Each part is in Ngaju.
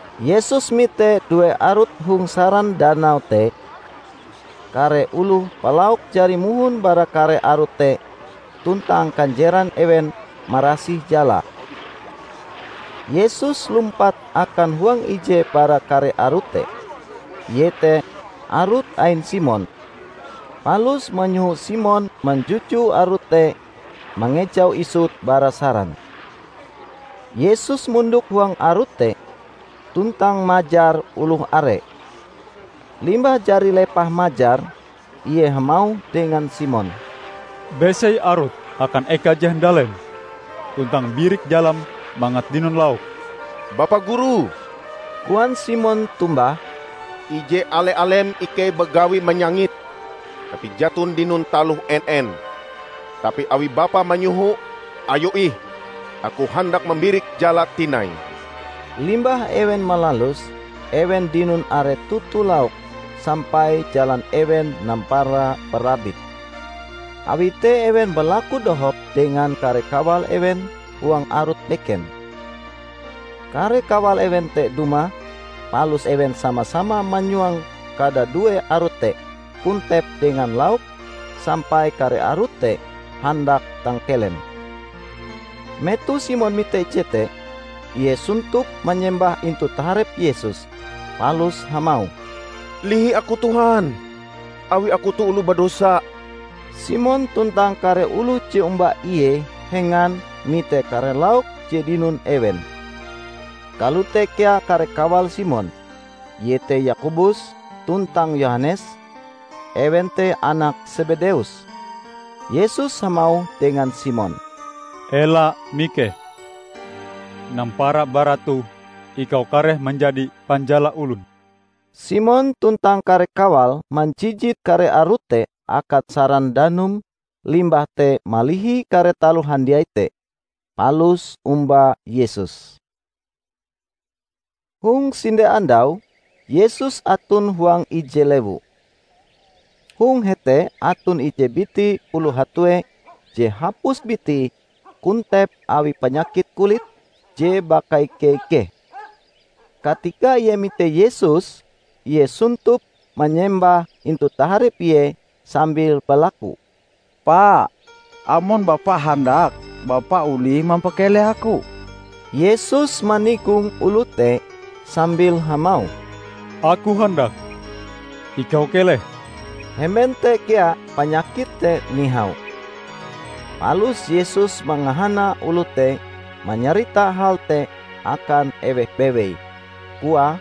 Yesus mite due arut hong saran danau te; kare oloh palauk jari mohon bara kare arut te tuntang kanjeran ewen marasih jalae. Yesus lumpat akan huang ije bara kare arut te, iete arut ain Simon, palus manyoho Simon manjuju arute te mangejaue isut bara saran. Yesus mondok huang arut te tuntang majar oloh are. Limbah jari lepah majar, Ie hamauh dengan Simon, "Besei arutm akan eka je handalem, tuntang birik jalam mangat dinon lauk." "Bapa Guru," koan Simon tombah, "ije ale-alem ikei bagawi manyangit, tapi jaton dinon taloh en-en! Tapi awi Bapa manyoho, ayo ih; aku handak mambirik jala tinai." Limbah ewen malaluse, ewen dinon are toto lauk sampai jalan ewen nampara barabit. Awi te ewen balaku dohop dengan kare kawal ewen huang arut beken. Kare kawal ewen te dumah palus ewen sama-sama manyuang kadadue arut te kontep dengan lauk sampai kare arut te handak tangkelem. Metoh Simon mite jete, ie sontop manyembah intu taharep Yesus, palus hamauh, "Lihi aku Tuhan! Awi aku oloh badosa!" Simon tuntang kare oloh je omba ie hengan mite kare lauk je dinon ewen. Kalote kea kare kawal Simon, iete Yakobus tuntang Yohanes, ewen te anak Sebedeus. Yesus hamauh dengan Simon, "Ela mikeh! Nampara bara toh ikau kareh manjadi panjala olon." Simon tuntang kare kawale manjijit kare arut te akan saran danum limbah te malihi kare taloh handiai te, palus omba Yesus. Hong sinde andau, Yesus aton huang ije lewu. Hong hete aton ije biti oloh hatue je hapus bitie kontep awi panyakit kulit je bakaike-ikeh. Katika ie mite Yesus, ie sontop manyembah intu taharep Ie sambil balaku, "Pa, amon Bapa handak, Bapa olih mampakeleh aku!" Yesus manigong oloh te sambil hamauh, "Aku handak, ikau keleh!" Hemben te kea panyakite te nihau. Palus Yesus mangahana oloh te manyarita hal te akan eweh bewei, koae,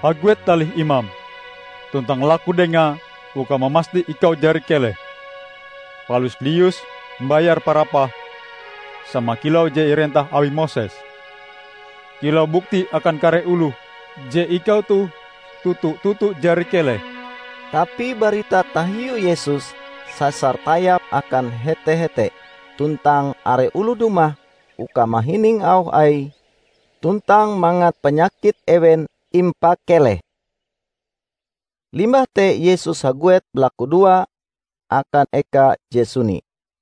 "Haguet talih imam, tuntang laku dengae uka mamasti ikau jari keleh. Palus lius mbayar parapahm sama kilau je irentah awi Moses, kilau bukti akan kare oloh je ikau toh toto-toto jari keleh." Tapi barita tahiu Yesus sasar tayap akan hete-hete, tuntang are oloh dumah uka mahining auh Aie tuntang mangat panyakit ewen impakeleh. Limbah te Yesus haguet balakudoa akan eka je suni.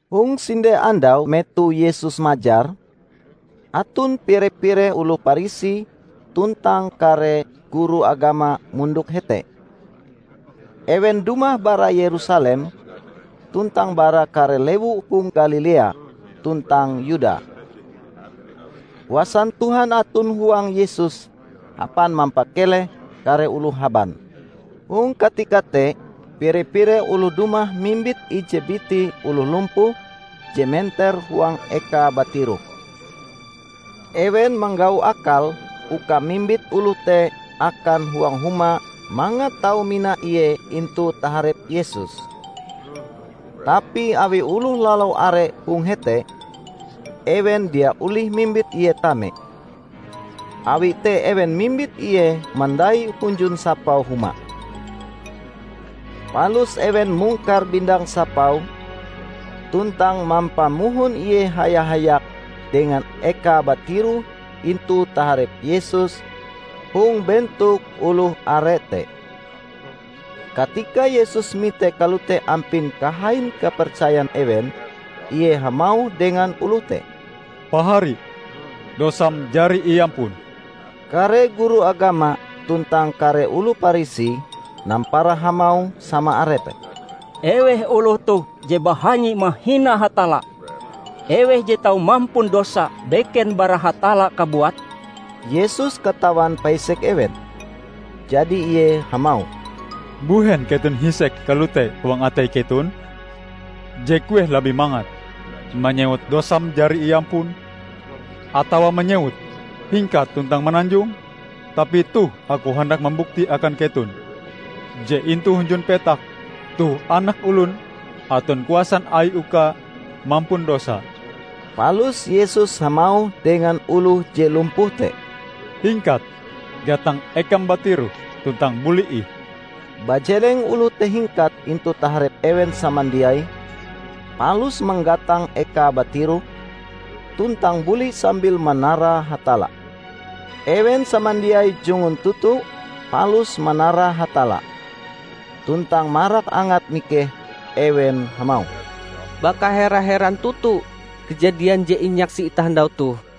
Hong sinde andau metoh Yesus majar, aton pire-pire oloh Parisi tuntang kare guru agama mondok hete. Ewen dumah bara Yerusalem, tuntang bara kare lewu hong Galilea tuntang Yuda. Kuasan Tuhan aton huang Yesus hapan mampakeleh kare oloh haban. Hong katika te pire-pire oloh dumah mimbit ije biti oloh lumpuh je menter huang ekae batiroh. Ewen manggau akal uka mimbit oloh te akan huang huma mangat tau mina ie intu taharep Yesus. Tapi awi oloh lalau are hong hete, ewen dia olih mimbit ie tame. Awi te ewen mimbit ie mandai hunjun sapau huma. Palus ewen mungkar bindang sapau, tuntang mampamohon ie haya-hayak dengan ekae batiroh intu taharep Yesus hong bentok oloh are te. Katika Yesus mite kalote ampin kahain kapercayan ewen, Ie hamauh dengan oloh te, "Pahari, dosam jari iampun." Kare guru agama tuntang kare oloh Parisi nampara hamauh sama arepe, "Eweh oloh toh je bahanyi mahina Hatalla? Eweh je tau mampun dosa beken bara Hatalla kabuat?" Yesus katawan paisek ewen. Jadi Ie hamauh, "Mbuhen keton hisek kalote huang atei keton? Je kueh labih mangat, manyewut, 'Dosam jari iampun', atawa manyewut, 'Hingkat tuntang mananjong!'? Tapi toh Aku handak mambukti akan keton je intu hunjun petak toh Anak Olon aton kuasan Aie uka mampun dosa." Palus Yesus hamauh dengan oloh je lumpuh te, "Hingkat, gatang ekam batiroh, tuntang buli ih!" Bajeleng oloh te hingkat intu taharep ewen samandiai, palus manggatang ekae batiroh, tuntang buli sambil manara Hatalla. Ewen samandiai jungun toto palus manara Hatalla. Tuntang marak angate mikeh, ewen hamauh, "Baka hera-heran toto kajadian je inyaksi itah andau toh!"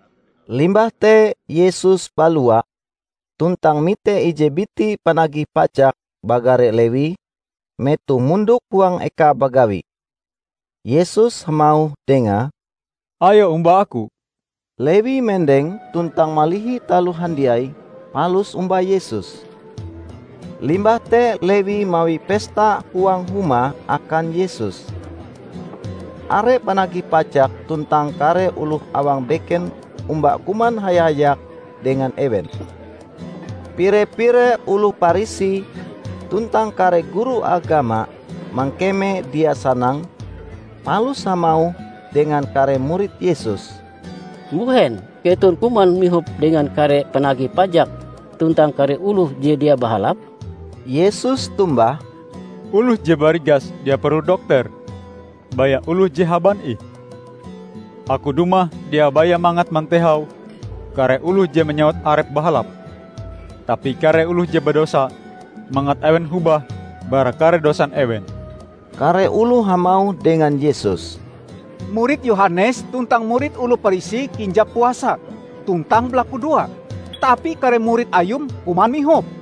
Limbah te Yesus balua tuntang mite ije biti panagih pajak bagare Lewi, metoh mondok huang ekae bagawi. Yesus hamauh dengae, "Ayo omba Aku." Lewi mendeng tuntang malihi taloh handiai, palus omba Yesus. Limbah te Lewi mawi pesta huang huma akan Yesus. Are panagih pajak tuntang kare oloh awang beken omba kuman haya-hayak dengan ewen. Pire-pire oloh Parisi tuntang kare guru agama mangkeme dia sanang, palus hamauh dengan kare murid Yesus, "Mbuhen keton kuman mihop dengan kare panagih pajak tuntang kare oloh je dia bahalap?" Yesus tombah, "Oloh je barigas dia perlu dokter; baya oloh je haban ih. Aku dumah dia baya mangat mantehau kare oloh je manyewut arepe bahalap, tapi kare oloh je badosa mangat ewen hobah bara kare dosan ewen." Kare oloh hamauh dengan Yesus, "Murid Yohanes tuntang murid oloh Parisi kinjap puasa tuntang balakudoa. Tapi kare murid Ayum kuman mihop."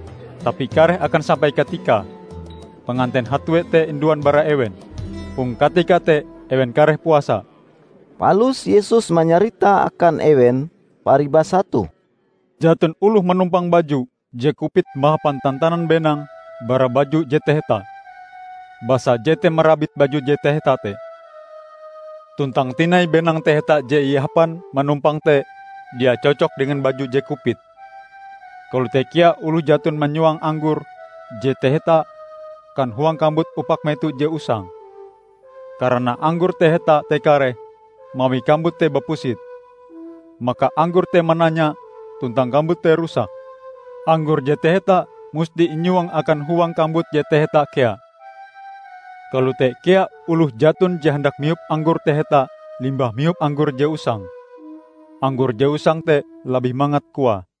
Tapi kareh akan sampai katikae panganten hatue te induan bara ewen. Hong katika te ewen kareh puasa." Palus Yesus manyarita akan ewen paribasa toh, "Jaton oloh manumpang baju je kupit mahapan tantanan benang bara baju je taheta. Basa jete marabit baju je taheta te. Tuntang tinai benang taheta je ihapan manumpang te dia cocok dengan baju je kupit. Kalote kea oloh jaton manyuang anggor je taheta akan huang kambut upak meto je usang, karana anggor taheta te kareh mawi kambut te bapusit. Maka anggor te mananya, tuntang kambut te rusak. Anggor je taheta musti inyuang akan huang kambut je taheta kea. Kalote kea oloh jaton je handak mihop anggor taheta limbah mihop anggor je usang. 'anggor je usang te labih mangat,' koae."